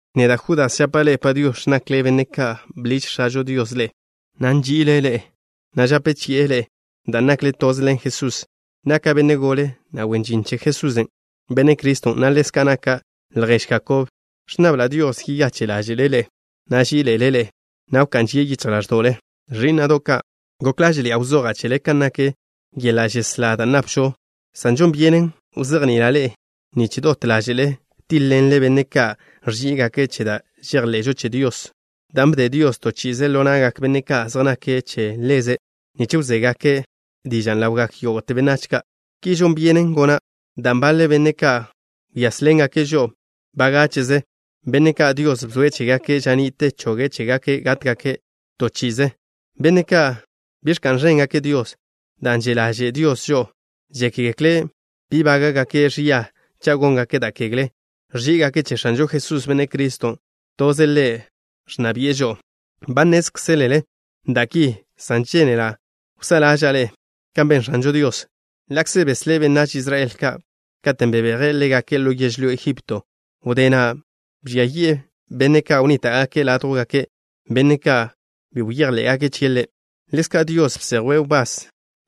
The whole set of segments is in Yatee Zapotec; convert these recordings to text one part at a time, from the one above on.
Neda', Judas, žapa' ḻe'e “Padiox̱”, nakle benne' ka' bḻiž X̱ažo Dios ḻe'e, na' nži'ile' ḻe'e, na' žape chi'e ḻe'e dan' nakle toze ḻen Jesús. Naka' benne' gole, na' wen žin che Jesusen', Benne' Criston', na' ḻezka' naka' ljež Jakob. Ẕnnabla' Dios yeyache' ḻáže'ḻe' ḻe'e, na' ží'iḻe'ele' ḻe'e, na' wká'n žie' yichj ḻáẕdo'le. Ẕí'na'do' ka', gok ḻáže'ḻi'a wzoja' chele kan nak yeḻa' žeslá da' napžon, san žon byenen wzejni'ila' ḻe'e nich dot ḻáže'le tíḻ-ḻenle benne' ka' ẕží'igake' che da' žejḻe'žo che Dios, dan' bde Dios to chi'ize ḻo na'gak benne' ka' zej nake' che Ḻeze' nich wzégake' dižan' ḻawgak yógo'te benách ka'. Ki žon byenen gona' dan' baḻe benne' ba wyázḻengake' žo'o bagáche'ze, benne' ka' Dios bzoe' chégake' ža ni'te choge' chégake' gátgake' to chi'ize. Benne' ka' bi ẕka'n ẕéngake' Dios. Dan' že' ḻaže' Dios žo'o, žékgekle' bi bága'gake' ẕia cha' góngake' da' kegle. Ẕží'igake' che X̱anžo Jesús, Benne' Criston'. Toze' Ḻe' ẕnna bi'e žo'o. Ba nnézkzelele da' ki, san žénela' wsá'a ḻáže'le kan ben X̱anžo Dios. Ḻa'kze beslé' benách Israel ka' katen' bebeje' ḻégake' ḻo yežlyó Egipto, wdé na' bžia yi'e benne' ka' wnníta'gake' ládjwgake', benne' ka' bi bejḻé'gake' chie' Ḻe'. Ḻezka', Dios bsejwe' wbás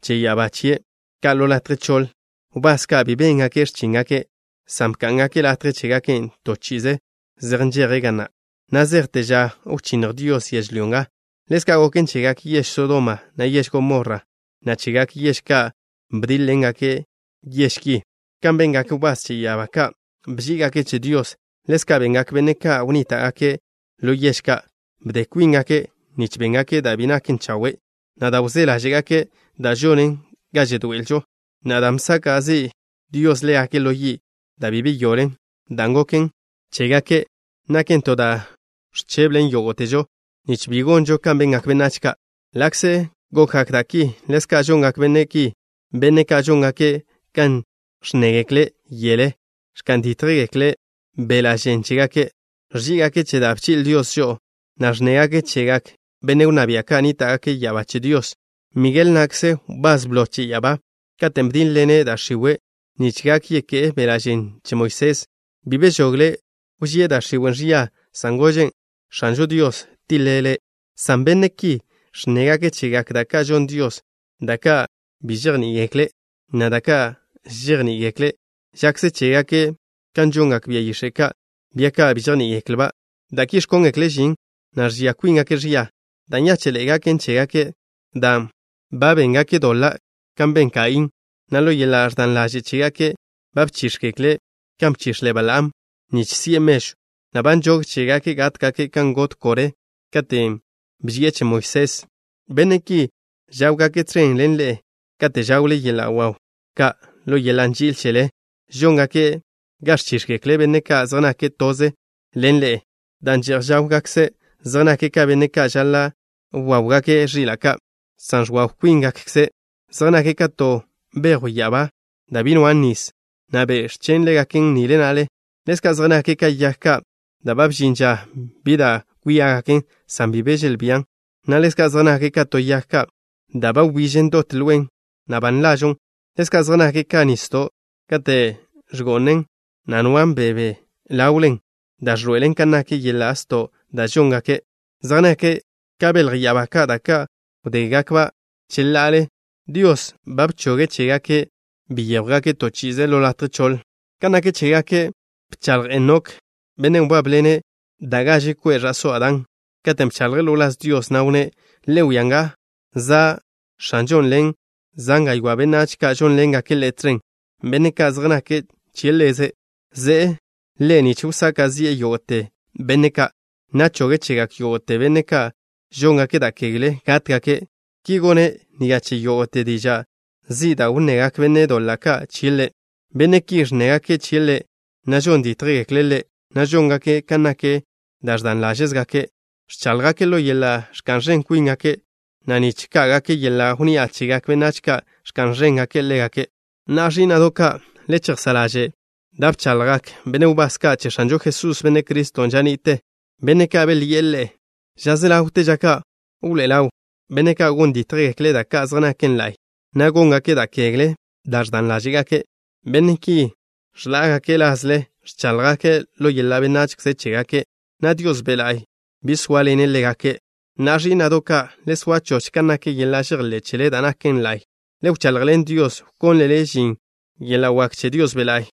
che ya'abá chie' ka' ḻo latje choḻ, wbás ka' bi béngake' x̱chíngake', san bká'ngake' latje chégake'. To chi'ize zej nžeje' ga na', na' zejte ža wchínnj Dios yežlyó nga. Ḻezka' goken chegak yež Sodoma, na' yež Gomorra, na' chegak yež ka' bdílegaken yež ki. Kan bengak wbás che ya'abá ka', bží'igake' che Dios, ḻezka' bengak benne' ka' wnníta'gake' ḻo yež ka'. Bde kwíngake' nich béngake' da' bi naken chawe', na' da' wzé ḻáže'gake', dan' žonen ga žedoe'elžo. Na'a, dan' bsaka' zi' Dios ḻégake' ḻo yi' da' bi yeyoḻen, dan' goken chégake' naken to da' ẕcheblen yógo'težo, nich bi gonžo kan bengak benách ka'. Ḻa'kze gokgak da' ki, ḻezka' žongak benne' ki, benne' ka' žóngake' kan ẕnnégekle' yele. Ẕka'n dítjgake' beḻa' žen chégake'. Ẕží'igake' che da' bchi'le Dios žo'o, na' ẕnnégake' chegak benne' wnná bia' ka' nníta'gake' ya'abá che Dios. Migel na'kze, wbás blo che ya'abá, katen' bdíḻ-ḻene' da' x̱iwe' nich gak yeké'e beḻa' žen che Moisés, bi bežogle' wžíe' da' x̱iwe' ẕia, san gožen': “X̱anžo Dios tiḻe' le'.” San benne' ki ẕnnégake' chegak da' ka' žon Dios, da' ka' bi žejní'igekle', na' da' ka' žejní'igekle' žakze chégake' kan žongak bia yix̱e' ka', bia ka' bi žejní'igeklba', da' ki ẕkóngekle' žin, na' ẕžia kwíngake' ẕia. Da' nyáche'ḻe'e gaken chégake' dan' ba béngake' doḻa' kan ben Kaín, na' ḻo yeḻa' ẕdan ḻaže' chégake' ba bchíx̱gekle' kan bchix̱le Balaam nich si'e mežw, na' ba nžog chégake' gátgake' kan got Koré katen' bži'e che Moisés. Benne' ki žáwgake' tẕen ḻen ḻe'e kate' žawle yeḻa' waw ka' ḻo yeḻa' nži'il chele. Žóngake' ga ẕchíx̱gekle benne' ka' zej nake' toze ḻen ḻe'e, dan' že'j žáwgakze'. Zej nake' ka benne' ka' žaḻa' wáwgake' ẕila' ka', san ẕwaw kwíngakze'. Zej nake' ka to bejw ya'abá da' bi nwan' nis, na' be' ẕchen' ḻégaken nile na'le. Ḻezka' zej nake' ka yag ka' ba bžin ža bi da' kwíagaken san bi be želbían, na' ḻezka' zej nake' ka to yag da' ba wbižen dot lwen, na' ba nlažon'. Ḻezka' zej nake' ka nisdo' katen' ẕgó'anen, na' nwan' bebe ḻawlen, da' ẕḻoe'elen kan nak yeḻa' sto' da' žóngake'. Zej nake' ka belj ya'abá ka', da' ka' wdégakba' cheḻa'ale. Dios ba bchoge' chégake' byéjwgake' to chi'ize ḻo latje choḻ. Kan nak chégake' bchaḻj Enok, bennen' wbábḻene' da' gaže kwe' ẕa'só Adán, katen' bchaḻje' ḻo wláz Dios, na' wnné': “Le wia nga, za' X̱anžon' ḻen zan gaywá' benách ka' žónḻengake' Ḻe' tẕen, benne' ka' zej nake' che Ḻeze'. Ze'e Ḻe' nich wsaka' zi'e yógo'te benne' ka', na' choge' chegak yógo'te benne' ka' žóngake' da' kegle gátgake'.” Ki gone' ni'a che yógo'te diža' zi' da' wnnegak benne' doḻa' ka' chie' Ḻe'. Benne' ki ẕnnégake' chie' Ḻe', na' žon dítjgekle' Le', na' žóngake' kan nak da' ẕdan ḻáže'gakze'. Ẕcháḻjgake' ḻo yeḻa' ẕka'n ẕen kwíngake', na' nich ká'gake' yeḻa' wnni'a chegak benách ka', ẕka'n ẕéngake' ḻégake'. Na'a, ẕí'na'do' ka', le chejsá' ḻaže' da' bchaḻjgak benne' wbás ka' che X̱anžo Jesús, Benne' Criston', ža ni'te. Benne' ka' belyi'e ḻe'e: “Ža se ḻawte ža ka' wḻoé'e ḻawgak benne' ka' gon dítjgekle' da' ka' zej naken la'y, na' góngake' da' kegle da' ẕdan ḻáže'gake'.” Benne' ki ẕḻá'agake' lažle. Ẕcháḻjgake' ḻo yeḻa' benachze chégake', na' Dios Be' La'y bi zóaḻene' ḻégake'. Na'a, ẕí'na'do' ka', le soa choch kan nak yeḻa' žejḻé' chele, da' naken la'y. Le wchaḻjḻen Dios, wkónlele žin yeḻa' wak che Dios Be' La'y.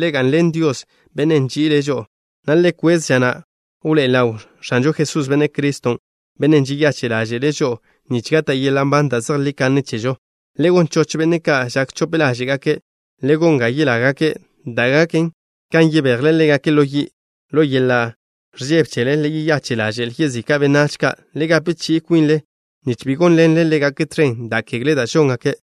Le ga'nḻen Dios, Bennen' nži'ile' žo'o, na' le kwez ža na' wḻoé'e ḻaw X̱anžo Jesús, Benne' Criston', Bennen' žeyache' ḻáže'le' žo'o, nich gata' yeḻa' nban da' zejlí kanne chežo. Le gon choch benne' ka' žak chope ḻáže'gake'. Le gon ga yelágake', da' gaken kan yebejle ḻégake' ḻo yi'. Ḻo yeḻa' ẕžebe chele le yeyache' ḻaže'l yezika' benách ka'. Le gape chi'i kwinle, nich bi gónḻenle ḻégake' tẕen da' kegle da' žóngake'.